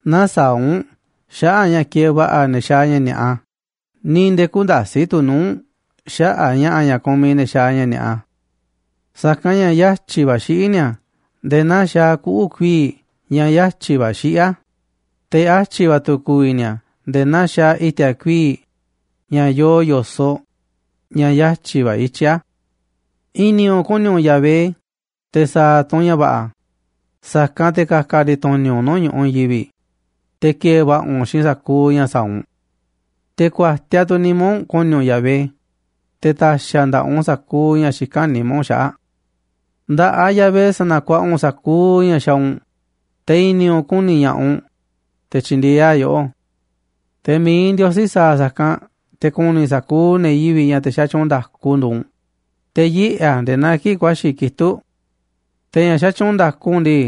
Nä̱saa̱ꞌ u̱nꞌ xaꞌa̱ꞌ ña̱ kieeꞌ va̱ꞌa̱ ne̱ xaaꞌ ña̱ ni̱a̱ꞌa, ni̱ nde̱e̱ kü̱nda̱si̱ꞌ tu̱ nuu̱ꞌ u̱nꞌ xaꞌa̱ꞌ ña̱ꞌa̱ ña̱ kumiꞌ ne̱ xaaꞌ ña̱ ni̱a̱ꞌa. Sa̱kanꞌ ña̱ yatyi̱ va̱ xiꞌí ni̱a̱ nde̱e̱ naa xaaꞌ kuꞌu̱ kuii̱ꞌ ña̱ yatyi̱ va̱ xiꞌí a̱, te̱ yatyi̱ va̱ tu̱ ku̱vi̱ ni̱a̱ nde̱e̱ naa xaaꞌ i̱ti̱a̱ kuii̱ꞌ ña̱ yoo yo̱soꞌ, ña̱ yatyi̱ va̱ ityí a̱. I̱ni̱ u̱nꞌ ku̱ni̱ u̱nꞌ Yahvé, te̱ sa̱a̱ tu̱ u̱nꞌ ña̱ va̱ꞌa̱, sa̱kanꞌ te̱ ka̱ka̱ ndi̱tu̱ni̱ u̱nꞌ nuu̱ꞌ ñu̱ꞌuꞌ i̱i̱n yivi̱ꞌ, te̱ ki̱e̱e̱ va̱ꞌa̱ u̱nꞌ xiinꞌ sa̱kuuꞌ ña̱ sa̱a̱ u̱nꞌ. Te̱ ku̱a̱tiaꞌ tu̱ nimá u̱nꞌ ku̱ni̱ u̱nꞌ Yahvé, te̱ ta̱xi̱ a̱ nda̱ꞌaꞌ u̱nꞌ sa̱kuuꞌ ña̱ xikán nimá u̱nꞌ xaꞌa̱ꞌ. Nda̱ꞌaꞌ Yahvé sa̱na̱kuaꞌa u̱nꞌ sa̱kuuꞌ ña̱ xaaꞌ u̱nꞌ, te̱ i̱ni̱ u̱nꞌ ku̱ni̱ ña̱ꞌaꞌ u̱nꞌ, te̱ tyi̱ndi̱e̱eꞌ a̱ yoꞌó. Te̱ mi̱iꞌ Ndiosí sa̱a̱ sa̱kanꞌ te̱ ku̱ni̱ sa̱kuuꞌ ne̱ yivi̱ꞌ ña̱ te̱ xatyuunꞌ nda̱ku nduuꞌ u̱nꞌ, te̱ yiꞌe̱ a̱ nde̱e̱ naa kii̱ꞌ ku̱a̱xi̱ kitúꞌ. Te̱ ña̱ xatyuunꞌ nda̱ku u̱nꞌ ndii,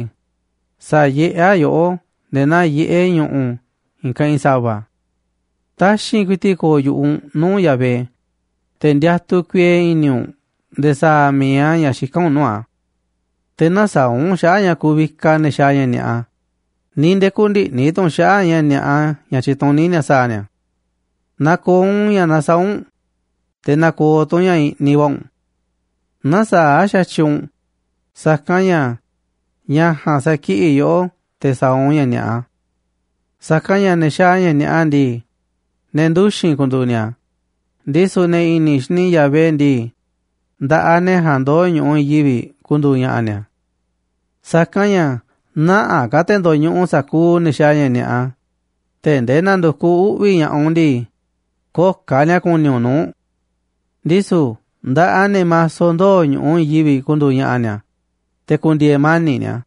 sa̱yiꞌé a̱ yoꞌó nde̱e̱ naa yiꞌé ñu̱ꞌu̱ i̱i̱n keꞌinꞌ sa̱va̱. Taxi̱nꞌ ku̱i̱ti̱ꞌ ko̱o̱ yu̱ꞌuꞌ u̱nꞌ nuu̱ꞌ Yahvé, te̱ ndiatuꞌ kuiee i̱ni̱ u̱nꞌ nde̱e̱ sa̱a̱ a̱ mi̱iꞌ a̱ ña̱ xikán u̱nꞌ nuu̱ꞌ a̱. Te̱ nä̱saa̱ꞌ u̱nꞌ xaꞌa̱ꞌ a̱ ña̱ kuvikaꞌ ne̱ xaaꞌ ña̱ ni̱a̱ꞌa, ni̱ nde̱e̱ kü̱ndi̱ꞌni̱ tu̱ u̱nꞌ xaꞌa̱ꞌ ña̱ ni̱a̱ꞌa ña̱ tyituní ni̱a̱ sa̱a̱ ni̱a̱. Na̱ko̱o̱ u̱nꞌ ña̱ nasaáꞌ u̱nꞌ, te̱ na̱ko̱o̱ tu̱ u̱nꞌ ña̱ i̱ꞌniꞌ va̱ u̱nꞌ. Nä̱saa̱ꞌ xa̱tyiꞌ u̱nꞌ, sa̱kanꞌ ña̱ ña̱ ja̱a̱nꞌ sakiꞌi̱ꞌ yoꞌó te̱ sa̱a̱ u̱nꞌ ña̱ ni̱a̱ꞌa. Sa̱kanꞌ ña̱ ne̱ xaaꞌ ña̱ ni̱a̱ꞌa ndii, ne̱ nduxi̱n ku̱ndu̱u̱ ni̱a̱, ndisu̱ ne̱ i̱ni̱ xini Yahvé ndii, nda̱ꞌaꞌ ne̱ ja̱a̱nꞌ ndoo̱ ñu̱ꞌuꞌ i̱i̱n yivi̱ꞌ ku̱ndu̱u̱ ña̱ꞌa̱ ni̱a̱. Sa̱kanꞌ ña̱ nä̱ꞌaꞌ ka̱ te̱ ndo̱ñuꞌuꞌ sa̱kuuꞌ ne̱ xaaꞌ ña̱ ni̱a̱ꞌa, tee̱ꞌ ndee na̱ndu̱kuꞌ uꞌvi̱ ña̱ꞌaꞌ u̱nꞌ ndii, köo̱ꞌ ka̱ ni̱a̱ ku̱ni̱ u̱nꞌ nuu̱ꞌ. Ndisu̱ nda̱ꞌaꞌ ne̱ maso ndoo̱ ñu̱ꞌuꞌ i̱i̱n yivi̱ꞌ ku̱ndu̱u̱ ña̱ꞌa̱ ni̱a̱, te̱ ku̱ndi̱e̱e̱ mani̱ꞌ ni̱a̱.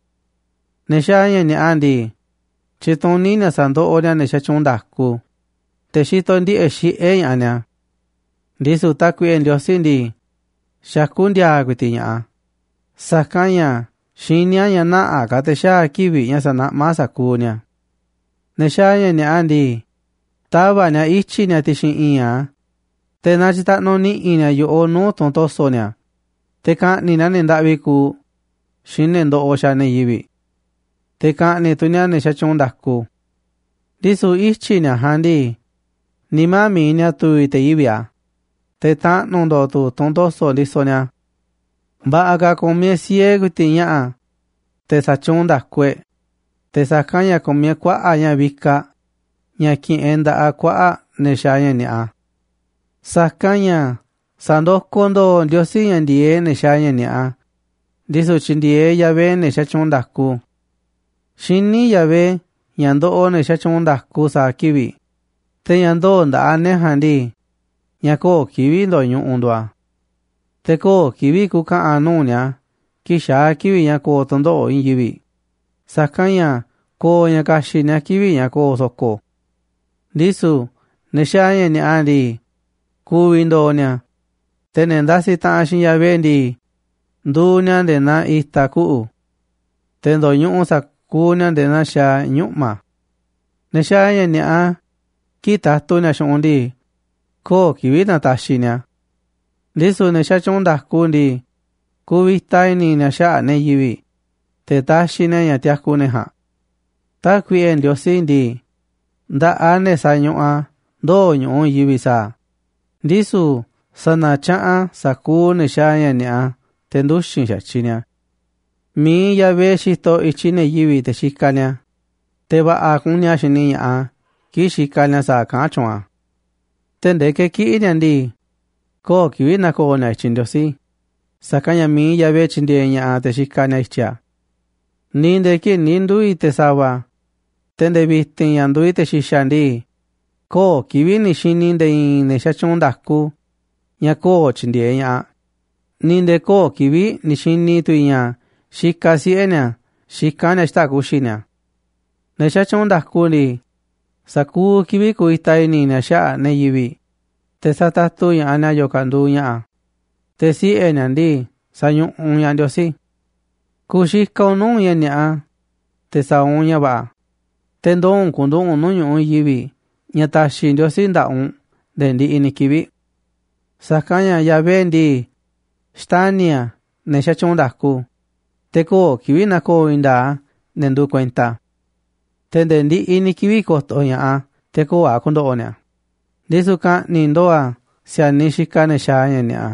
Ne̱ xaaꞌ ña̱ ni̱a̱ꞌa ndii, tyituní ni̱a̱ sa̱ndoꞌoꞌ ni̱a̱ ne̱ xatyuunꞌ nda̱ku, te̱ xitoꞌ ndiꞌe̱ꞌ xiꞌé ña̱ꞌaꞌ ni̱a̱. Ndisu̱ Tákuiꞌe Ndiosí ndii, xakú ndi̱a̱a̱ ku̱i̱ti̱ꞌ ña̱ꞌaꞌ a̱, sa̱kanꞌ ña̱ xiní a̱ ña̱ nä̱ꞌaꞌ ka̱ te̱ xaa̱ kivi̱ꞌ ña̱ sa̱naꞌmá a̱ sa̱kuuꞌ ni̱a̱. Ne̱ xaaꞌ ña̱ ni̱a̱ꞌa ndii, tava̱ꞌ ni̱a̱ ityi̱ ni̱a̱ ti̱xi̱n i̱i̱nꞌ a̱, te̱ natyitaꞌnuꞌ ni̱ꞌi̱ ni̱a̱ yo̱ꞌoꞌ nuu̱ꞌ tunꞌ to̱so̱ ni̱a̱, te̱ ka̱ꞌni̱ꞌ ni̱a̱ ne̱ ndaꞌvi kuuꞌ xiinꞌ ne̱ ndoꞌoꞌ xaaꞌ ne̱ yivi̱ꞌ. Te̱ ka̱ꞌni̱ꞌ tu̱ ni̱a̱ ne̱ xatyuunꞌ nda̱ku. Ndisu̱ ityi̱ ni̱a̱ ja̱a̱nꞌ ndii, nimá mi̱iꞌ ni̱a̱ tu̱vi̱ te̱ yivi̱ꞌ a̱, te̱ taꞌnu̱ ndo̱o̱ tu̱ tunꞌ to̱so̱ ndisoꞌ ni̱a̱. Va̱ꞌa̱ ka̱ ku̱miꞌ e̱ꞌ siee ku̱i̱ti̱ꞌ ña̱ꞌa̱, te̱ xatyuunꞌ nda̱ku e̱ꞌ, te̱ sa̱kanꞌ ña̱ ku̱miꞌ e̱ꞌ kuaꞌa̱ꞌ ña̱ vikaꞌ ña̱ ki̱ꞌi̱n e̱ꞌ nda̱ꞌaꞌ kuaꞌa̱ꞌ ne̱ xaaꞌ ña̱ ni̱a̱ꞌa. Sa̱kanꞌ ña̱ sa̱ndokoꞌ ndo̱o̱ Ndiosí ña̱ ndi̱e̱eꞌ ne̱ xaaꞌ ña̱ ni̱a̱ꞌa, ndisu̱ tyindieeꞌ Yahvé ne̱ xatyuunꞌ nda̱ku. Xiní Yahvé ña̱ ndoꞌoꞌ ne̱ xatyuunꞌ nda̱ku sa̱a̱ kivi̱ꞌ, te̱ ña̱ ndoo̱ nda̱ꞌaꞌ ne̱ ja̱a̱nꞌ ndii, ña̱ köo̱ꞌ kivi̱ꞌ ndo̱ñuꞌuꞌ nduuꞌ a̱. Te̱ köo̱ꞌ kivi̱ꞌ ku̱ka̱ꞌa̱n nuu̱ꞌ ni̱a̱ kii̱ꞌ xaa̱ kivi̱ꞌ ña̱ ko̱o̱ tu̱ndoꞌo̱ꞌ i̱i̱n yivi̱, sa̱kanꞌ ña̱ ko̱o̱ ña̱ ka̱xi̱ꞌ ni̱a̱ kivi̱ꞌ ña̱ ko̱o̱ so̱ko̱. Ndisu̱ ne̱ xaaꞌ ña̱ ni̱a̱ꞌa ndii, ku̱vi̱ ndo̱o̱ ni̱a̱, te̱ ne̱ ndasiꞌ taꞌanꞌ xiinꞌ Yahvé ndii, nduuꞌ ni̱a̱ nde̱e̱ naa i̱ta̱ kuꞌu̱. Te̱ ndo̱ñuꞌuꞌ sa̱kuuꞌ ni̱a̱ nde̱e̱ naa xaaꞌ ñuꞌma̱. Ne̱ xaaꞌ ña̱ ni̱a̱ꞌa, kii̱ꞌ tatu ni̱a̱ xu̱ꞌunꞌ ndii, köo̱ꞌ kivi̱ꞌ nataxiꞌ ni̱a̱ a̱. Ndisu̱ ne̱ xatyuunꞌ nda̱ku ndii, kuvita i̱ni̱ ni̱a̱ xaꞌa̱ꞌ ne̱ yivi̱ꞌ, te̱ taxiꞌ ni̱a̱ ña̱ tiaku ne̱ ja̱a̱nꞌ. Tákuiꞌe Ndiosí ndii, nda̱ꞌaꞌ ne̱ sañuꞌuꞌ a̱ ndoo̱ ñu̱ꞌuꞌ i̱i̱n yivi̱ꞌ sa̱a̱ a̱, ndisu̱ sa̱na̱tyaꞌanꞌ a̱ sa̱kuuꞌ ne̱ xaaꞌ ña̱ ni̱a̱ꞌa te̱ nduxi̱n xa̱tyiꞌ ni̱a̱. Mi̱iꞌ Yahvé xitoꞌ i̱tyiꞌ ne̱ yivi̱ꞌ te̱ xikaꞌ ni̱a̱, te̱ va̱ꞌa̱ kuni a̱ xini ña̱ꞌaꞌ a̱ kii̱ꞌ xikaꞌ ni̱a̱ sa̱a̱ kaꞌán tyuunꞌ a̱. Tee̱ꞌ ndee ke̱kiꞌi̱ ni̱a̱ ndii, köo̱ꞌ kivi̱ꞌ na̱ko̱o̱ ni̱a̱ i̱tyiꞌ Ndiosí, sa̱kanꞌ ña̱ mi̱iꞌ Yahvé tyindieeꞌ ña̱ꞌaꞌ te̱ xikaꞌ ni̱a̱ i̱tyiꞌ a̱. Ni̱ nde̱e̱ kii̱ꞌ ni̱ nduu̱ i̱ te̱ sa̱va̱, te̱ nde̱e̱ vi̱ti̱n ña̱ nduuꞌ i̱ te̱ xi̱xa̱ ndii, köo̱ꞌ kivi̱ꞌ ni̱ xi̱ni̱ i̱ nde̱e̱ i̱i̱n ne̱ xatyuunꞌ nda̱ku ña̱ köo̱ꞌ tyindieeꞌ ña̱ꞌaꞌ, ni̱ nde̱e̱ köo̱ꞌ kivi̱ꞌ ni̱ xi̱ni̱ tu̱ i̱ ña̱ xikaꞌ siꞌe̱ ni̱a̱ xikán ni̱a̱ xita̱ꞌ ku̱xi̱ ni̱a̱. Ne̱ xatyuunꞌ nda̱ku ndii, sa̱kuuꞌ kivi̱ꞌ kuvita i̱ni̱ ni̱a̱ xaꞌa̱ꞌ ne̱ yivi̱ꞌ, te̱ satatu ña̱ꞌaꞌ ni̱a̱ yo̱o̱ ka̱ nduuꞌ ña̱ꞌa̱, te̱ siꞌe̱ ni̱a̱ ndii, sañuꞌuꞌ ña̱ꞌaꞌ Ndiosí. Ku̱xikaꞌ u̱nꞌ nuu̱ꞌ ña̱ ni̱a̱ꞌa, te̱ sa̱a̱ u̱nꞌ ña̱ va̱ꞌa̱, te̱ ndoo̱ u̱nꞌ ku̱nduꞌu̱ꞌ u̱nꞌ nuu̱ꞌ ñu̱ꞌuꞌ i̱i̱n yivi̱ꞌ ña̱ ta̱xi̱ Ndiosí nda̱ꞌaꞌ u̱nꞌ nde̱e̱ ndiꞌiꞌ ni̱ kivi̱ꞌ. Sa̱kanꞌ ña̱ Yahvé ndii, xtani̱ a̱ ne̱ xatyuunꞌ nda̱ku, te̱ köo̱ꞌ kivi̱ꞌ na̱ko̱o̱ i̱i̱n nda̱a̱ꞌ a̱ ne̱ nduuꞌ kuenta a̱. Te̱ nde̱e̱ ndiꞌiꞌ ni̱ kivi̱ꞌ ko̱to̱ ña̱ꞌaꞌ a̱ te̱ köo̱ꞌ a̱ ku̱ndo̱ꞌo̱ ni̱a̱, ndisu̱ ka̱ꞌni̱ꞌ ndo̱o̱ a̱ si̱a̱niꞌ xikaꞌ ne̱ xaaꞌ ña̱ ni̱a̱ꞌa.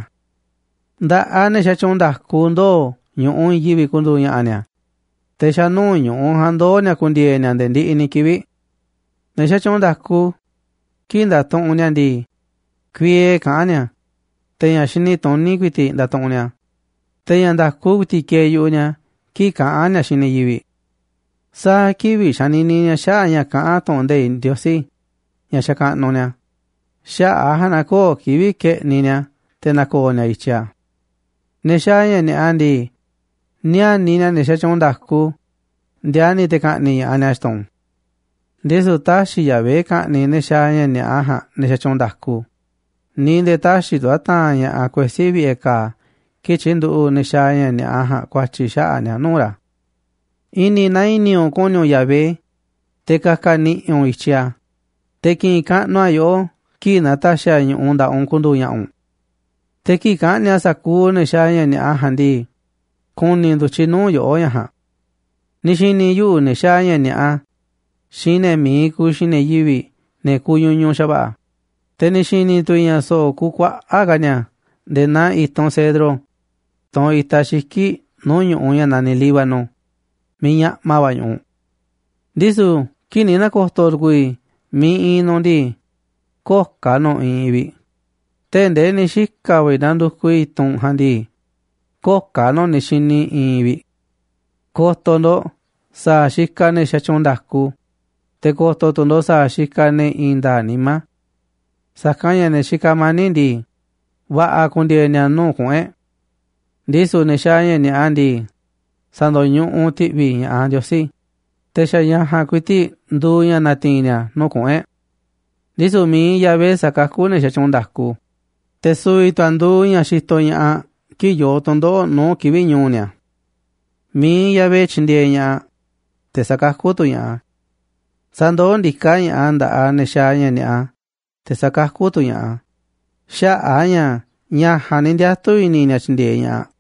Nda̱ꞌaꞌ ne̱ xatyuunꞌ nda̱ku ndoo̱ ñu̱ꞌuꞌ i̱i̱n yivi̱ꞌ ku̱ndu̱u̱ ña̱ꞌa̱ ni̱a̱, te̱ xa̱ nuu̱ꞌ ñu̱ꞌuꞌ ja̱a̱nꞌ ndoo̱ ni̱a̱ ku̱ndi̱e̱e̱ ni̱a̱ nde̱e̱ ndiꞌiꞌ ni̱ kivi̱ꞌ. Ne̱ xatyuunꞌ nda̱ku, kii̱ꞌ ndatuꞌunꞌ ni̱a̱ ndii, kuiee kaꞌán ni̱a̱, te̱ ña̱ xini tuní ku̱i̱ti̱ꞌ ndatuꞌunꞌ ni̱a̱, te̱ ña̱ nda̱ku ku̱i̱ti̱ꞌ kieeꞌ yu̱ꞌuꞌ ni̱a̱ kii̱ꞌ kaꞌán ni̱a̱ xiinꞌ ne̱ yivi̱ꞌ. Sa̱a̱ kivi̱ꞌ xanini ni̱a̱ xaꞌa̱ꞌ ña̱ kaꞌán tu̱ꞌu̱n nde̱iꞌ Ndiosí ña̱ xakaꞌnuꞌ ni̱a̱, xaꞌa̱ꞌ a̱ ja̱a̱nꞌ na köo̱ꞌ kivi̱ꞌ ke̱ꞌniꞌ ni̱a̱ te̱ na̱ko̱o̱ ni̱a̱ i̱tyiꞌ a̱. Ne̱ xaaꞌ ña̱ ni̱a̱ꞌa ndii, níániꞌ ni̱a̱ ne̱ xatyuunꞌ nda̱ku, ndiani̱ te̱ ka̱ꞌni̱ꞌ ña̱ꞌaꞌ ni̱a̱ xtun. Ndisu̱ tä̱xi̱ Yahvé ka̱ꞌni̱ꞌ ne̱ xaaꞌ ña̱ ni̱a̱ꞌa ja̱a̱nꞌ ne̱ xatyuunꞌ nda̱ku, ni̱ nde̱e̱ tä̱xi̱ tu̱ a̱ ta̱a̱nꞌ ña̱ꞌaꞌ kuesí vi̱ꞌe̱ ka̱a̱ kii̱ꞌ tyi̱nduꞌu̱ꞌ ne̱ xaaꞌ ña̱ ni̱a̱ꞌa ja̱a̱nꞌ ku̱a̱tyi̱ xaꞌa̱ꞌ ni̱a̱ nuu̱ꞌ ra̱. I̱ni̱ naa i̱ni̱ u̱nꞌ ku̱ni̱ u̱nꞌ Yahvé, te̱ ka̱ka̱ ni̱ꞌi̱ u̱nꞌ i̱tyiꞌ a̱, te̱ ki̱ꞌi̱n kaꞌnuꞌ a̱ yoꞌó kii̱ꞌ na̱ta̱xi̱ a̱ ñu̱ꞌuꞌ nda̱ꞌaꞌ u̱nꞌ ku̱ndu̱u̱ ña̱ꞌa̱ u̱nꞌ. Te̱ kii̱ꞌ ka̱ꞌni̱ꞌ a̱ sa̱kuuꞌ ne̱ xaaꞌ ña̱ ni̱a̱ꞌa ja̱a̱nꞌ ndii, ku̱ni̱ ndu̱tyiꞌ nuu̱ꞌ yoꞌó ña̱ ja̱a̱nꞌ. Ni̱ xi̱ni̱ yuꞌu̱ ne̱ xaaꞌ ña̱ ni̱a̱ꞌa xiinꞌ ne̱ mi̱iꞌ kuuꞌ xiinꞌ ne̱ yivi̱ꞌ ne̱ kuñuñuꞌ xa̱va̱ꞌa̱, te̱ ni̱ xi̱ni̱ tu̱ i̱ ña̱ so̱ꞌo̱ kukuaꞌa̱ꞌ ka̱ ni̱a̱ nde̱e̱ naa i̱tunꞌ cedro, tunꞌ itaꞌ xiki̱ꞌ nuu̱ꞌ ñu̱ꞌuꞌ ña̱ naniꞌ Líbano miiꞌ ñaꞌma va̱ ñu̱ꞌuꞌ. Ndisu̱ kii̱ꞌ ni̱ na̱ko̱to̱ tu̱ku̱u̱ i̱ miiꞌ iinꞌ nu̱ꞌ ndii, köo̱ꞌ ka̱ nu̱ꞌ iinꞌ vi̱ꞌ, tee̱ꞌ nde̱e̱ ni̱ xika̱ va̱ i̱ na̱ndu̱kuꞌ i̱ tunꞌ ja̱a̱nꞌ ndii, köo̱ꞌ ka̱ nu̱ꞌ ni̱ xi̱ni̱ iinꞌ vi̱ꞌ. Ko̱to̱ ndo̱ꞌ sa̱a̱ xikaꞌ ne̱ xatyuunꞌ nda̱ku, te̱ ko̱to̱ tu̱ ndo̱ꞌ sa̱a̱ xikaꞌ ne̱ i̱i̱n nda̱a̱ꞌ nimá. Sa̱kanꞌ ña̱ ne̱ xikaꞌ mani̱ꞌ ndii, va̱ꞌa̱ ku̱ndi̱e̱e̱ ni̱a̱ nuu̱ꞌ kuꞌu̱n e̱ꞌ. Ndisu̱ ne̱ xaaꞌ ña̱ ni̱a̱ꞌa ndii, sa̱ndo̱ñuꞌuꞌ ti̱ꞌvi̱ ña̱ꞌaꞌ Ndiosí, te̱ xa̱ ña̱ ja̱a̱nꞌ ku̱i̱ti̱ꞌ nduuꞌ ña̱ na̱ti̱i̱n ni̱a̱ nuu̱ꞌ kuꞌu̱n e̱ꞌ. Ndisu̱ mi̱iꞌ Yahvé sakakú ne̱ xatyuunꞌ nda̱ku, te̱ su̱vi̱ tu̱ a̱ nduuꞌ ña̱ xitoꞌ ña̱ꞌaꞌ kii̱ꞌ yoo tu̱ndoꞌo̱ꞌ nuu̱ꞌ kivi̱ꞌ ñu̱u̱ ni̱a̱. Mi̱iꞌ Yahvé tyindieeꞌ ña̱ꞌaꞌ, te̱ sa̱kakú tu̱ ña̱ꞌaꞌ a̱. Sa̱ndoó ndiká ña̱ꞌaꞌ a̱ nda̱ꞌaꞌ ne̱ xaaꞌ ña̱ ni̱a̱ꞌa, te̱ sa̱kakú tu̱ ña̱ꞌaꞌ a̱, xaꞌa̱ꞌ a̱ ña̱ ña̱ ja̱a̱nꞌ ni̱ ndiatu̱ i̱ni̱ ni̱a̱ tyi̱ndi̱e̱eꞌ ña̱ꞌaꞌ.